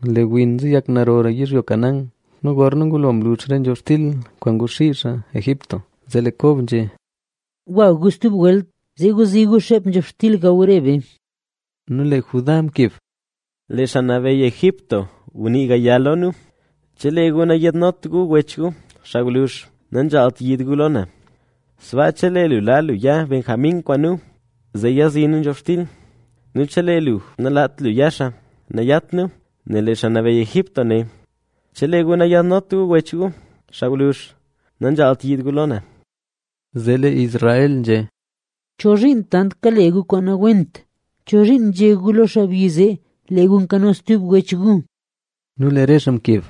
Lee win nzeyak narora yizhyo Canaán. Nu gorna ngulo mlux re nzhobxtil kwaan nguxii xaa Egipto, zee lee Kob nzhé: —Gwa gu stub welt, zee guzii gu xeep nzhobxtil gaw re be. Nu lee Judá mkeb: —Lee xaa nabeyy Egipto nguné lo nu: “Chelee gu nayaadnot gu wech gu xaa gwluzh, nanzhaalt yiid gu lo na”. Sbaa chelee lu laa lu ya Benjamín kwaan nu, zee yazii nu nzhobxtil. Nu chelee lu nalaat lu ya xaa, nayat nu, nel lee xaa nabeyy Egipto né: “Chelee gu nayaadnot gu wech gu, xaa gwluzh, nanzhaalt yiid gu lo na”. Zee lee Israel nzhé: —¿Chozhiin tant kale gu kwaan nawent? ¿Chozhiin nzhé gu lo xaabyi zee, lee gu nkano stub wech gu? Nu lee re xaa mkeb: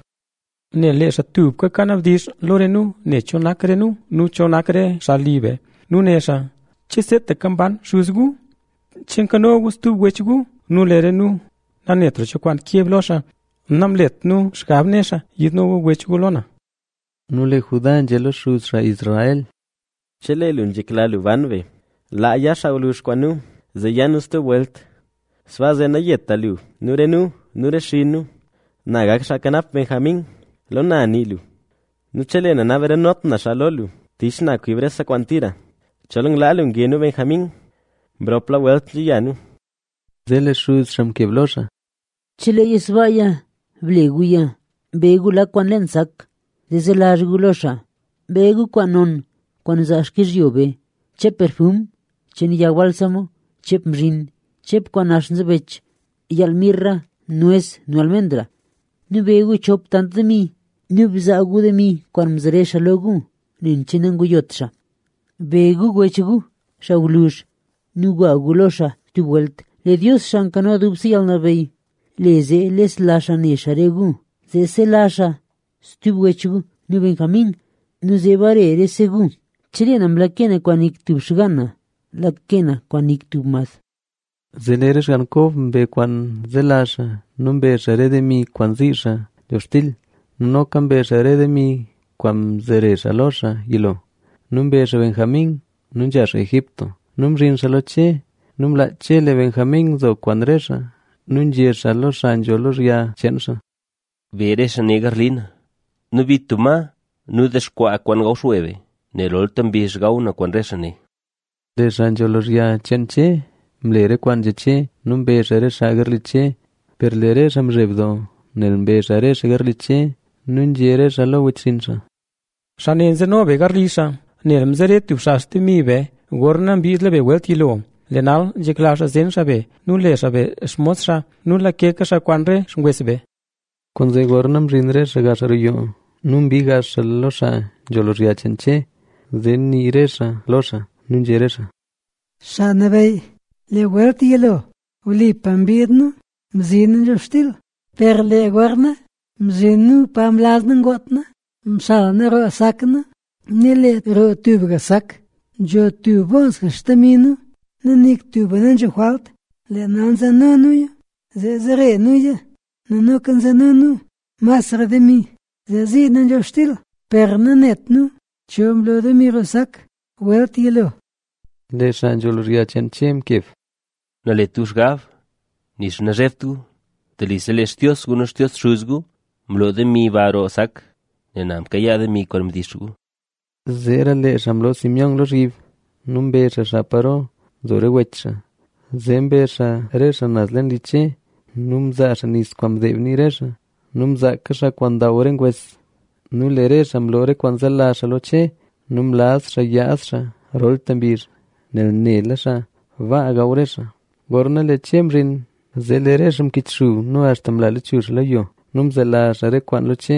—Nel lee xaa tubka kanabdizh lo nu ne cho nak re nu nu cho nak re xaa li be. Nu né xaa: “¿Che seetaka mban xuz gu? ¿Che nkano gu stub wech gu?” Nu lee re nu nanetra cho kwaan keb lo xaa. Namlet nu xgab né xaa: “Yiidno gu wech gu lo na”. Nu lee Judá nzhé lo xuz xaa Israel: —Chelee lu nzhekla lu ban be, laa ya xaa gwluzh kwaan nu, zee ya nu stub welt. Sbaa zee nayeta lu nu re nu nu re xinn nu. Na gak xaa kanap Benjamín. Lo na nii lu. Nu chelee na nabarenot na xaa lo lu, tich na kwib rese kwaan tira. Chol nglaa lu nge nu Benjamín, mropla welt nzha ya nu. Zee lee xuz xaa mkeb lo xaa: —¡Cheleeya sbaaya, ble guya! Be gu lak kwaan leen sak, zee zelazh gu lo xaa. Be gu kwaan non kwaan nzaa xkizhyo be: cheep perfum cheen yag bálsamo, cheep mzhin, cheep kwaan nax nzebech, yaal mirra, nues nu almendra. Nu be gu chop tant demi; nu bzaa gu demi kwaan mzere xaa lo gu, nen che nanguyot xaa. Be gu wech gu, xaa gwluzh nu gwa gu lo xaa stub welt. Lee Dios, Xaa Nkano Dubse Yalnabeyy le zee lesla xaa ne xaa re gu, zee sela xaa stub wech gu nu Benjamín nu zee bare rese gu. ¡Chelee na mlake na kwaan nik tub xgaan na, lake na kwaan nik tub mad! Lee re xgann Kob mbe kwaan zelazh xaa; nu mbe xaa re demi kwaan zii xaa nzhobxtil nu noka mbe xaa re demi kwaan mzere xaa lo xaa yilo. Nu mbe xaa Benjamín nu nzha xaa Egipto; nu mzhin xaa lo Che. Nu mlaach Che lee Benjamín nzo kwaan re xaa nu nzhé xaa lo xaa nzho lozhya re xcheen xaa: —Be xaa ne garli na nu bit tub la ngoon nu dexkwaa ma gaw xwe be, nel rolta mbizh gaw na kwaan re xaa ne. Lee xaa nzho lozhya cheen Che mle re kwaan nzhé Che nu mbe xaa re xaa garli Che. Per lee re xaa mzheb doo, nel mbe xaa re xaa garli Che nu nzhé re xaa lo wechxinn xaa: —Xaa ne nzeno be garli xaa, nel mzere tub xaa xtemi be gorna mbiid be welt yilo. Lee nal nzhekla xaa zen xaa be nu le xaa be xmos xaa nu lakeka xaa kwaan re xngwes be. Kwaanzee gorna mzhin re xaa roo yoo nu mbii gax xaa lo xaa nzho lozhya cheen Che, zee nii re xaa lo xaa. Nu nzhé re xaa: —Xaa nabeyy, lee welt yilo wlipa mbiid nu mzi nu nzhobxtil. Per lee gorna mzhin nu pa mlaz nu ngoot nu, mxal nu roo xsak nu nu lee roo tubga sak nzho tub boolsga xtemi nu nu nik tuba nanzho jwalt. Lee nal nzeno nuya, zee zere nuya. Nu noka nzeno nu masra demi zee zii nu nzhobxtil. Per nanet nu cho mlo demi roo sak welt yilo. Lee xaa nzho lozhya cheen Che mkeb: —Nalet gu xgab, nixa nazhebt gu; telise lee Xtios gu nu Xtios xuz gu mlo demi ba roo sak, nel na mkayaa demi kwaan mdix gu. Zeera lee xaa mloo Simeón lozhyib nu mbe xaa xaa paro nzo re wech xaa. Zee mbe xaa re xaa naz leen li Che. Nu mzaa xaa nis mdeeb nii re xaa nu mzaaka xaa kwaan ndaw re ngwes. Nu lee re xaa mloo re kwaan zelazh xaa lo Che. Nu mlaz xaa yaad xaa rolta mbizh, nel nela xaa baa gaw re xaa. Gorna lee Che mzhin, zee lee re xaa mkichxub nu axta mla lachuzh xaa lo yo. Nu mzelazh xaa re kwaan lo Che.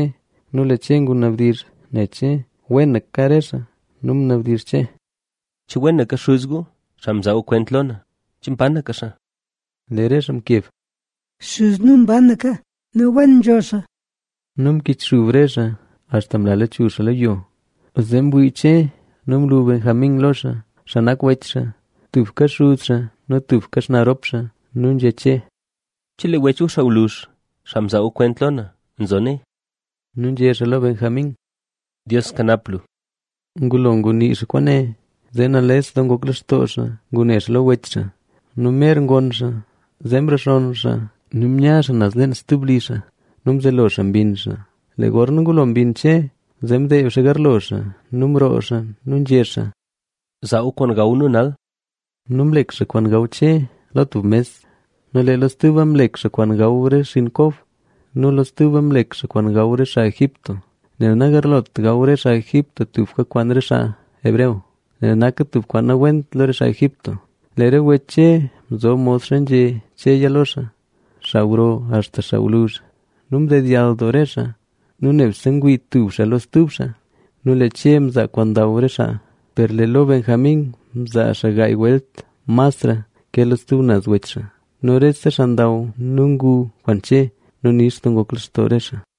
Nu lee Che ngunabdizh ne che wenaka re xaa. Nu ngunabdizh Che: —¿Che wenaka xuz gu, xaa mzaa gu kwent lo na? ¿Che mbanaka xaa? Lee re xaa mkeb: —Xuz nu mbanaka nu wen nzho xaa. Nu mkichxub re xaa axta mla lechuzh xaa lo yo. Zee mwii Che nu mlu Benjamín lo xaa, xaa nak wech xaa, tubka xuz xaa nu tubka xnaa rop xaa. Nu nzhé Che: —¿Chelee wech gu xaa gwluzh, xaa mzaa gu kwent lo na nzo nee? Nu nzhé xaa lo Benjamín: —Dios kanap lu. Ngulo ngunii xaa kwaane, zee nales doo ngok lextoo xaa ngune xaa lo wech xaa. Nu mer ngonn xaa, zee mrexonn xaa lo re xaa nu mya xaa naz leen stub li xaa. Nu mzelo xaa mbinn xaa. Lee gorna ngulo mbinn Che, zee mdeeb xaa garlo xaa nu mroo xaa nu nzhé xaa: —Zaa gu kwaan gaw nu nal. Nu mlek xaa kwaan gaw Che lo tub mes nu lee lo stuba mlek xaa kwaan gaw re xinn Kob nu lo stuba mlek xaa kwaan gaw re xaa Egipto. (Nel nagarlot gaw re xaa Egipto tubka kwaan xaa hebreo, nel naka tub kwaan nawent lo re xaa Egipto). Lee re wech Che mzob modxa nzhé Cheya lo xaa, xaa gro axta xaa gwluzh. Nu mdedyall doo re xaa nu nebse ngwii tub xaa lo stub xaa. Nu lee Che mzaa kwaan ndaw re xaa, per lee lo Benjamín mzaa xaa gaay welt masra ke lo stub naz wech xaa. Nu rese xaa ndaw nu ngu kwaan Che nu nix doo ngok lextoo re xaa.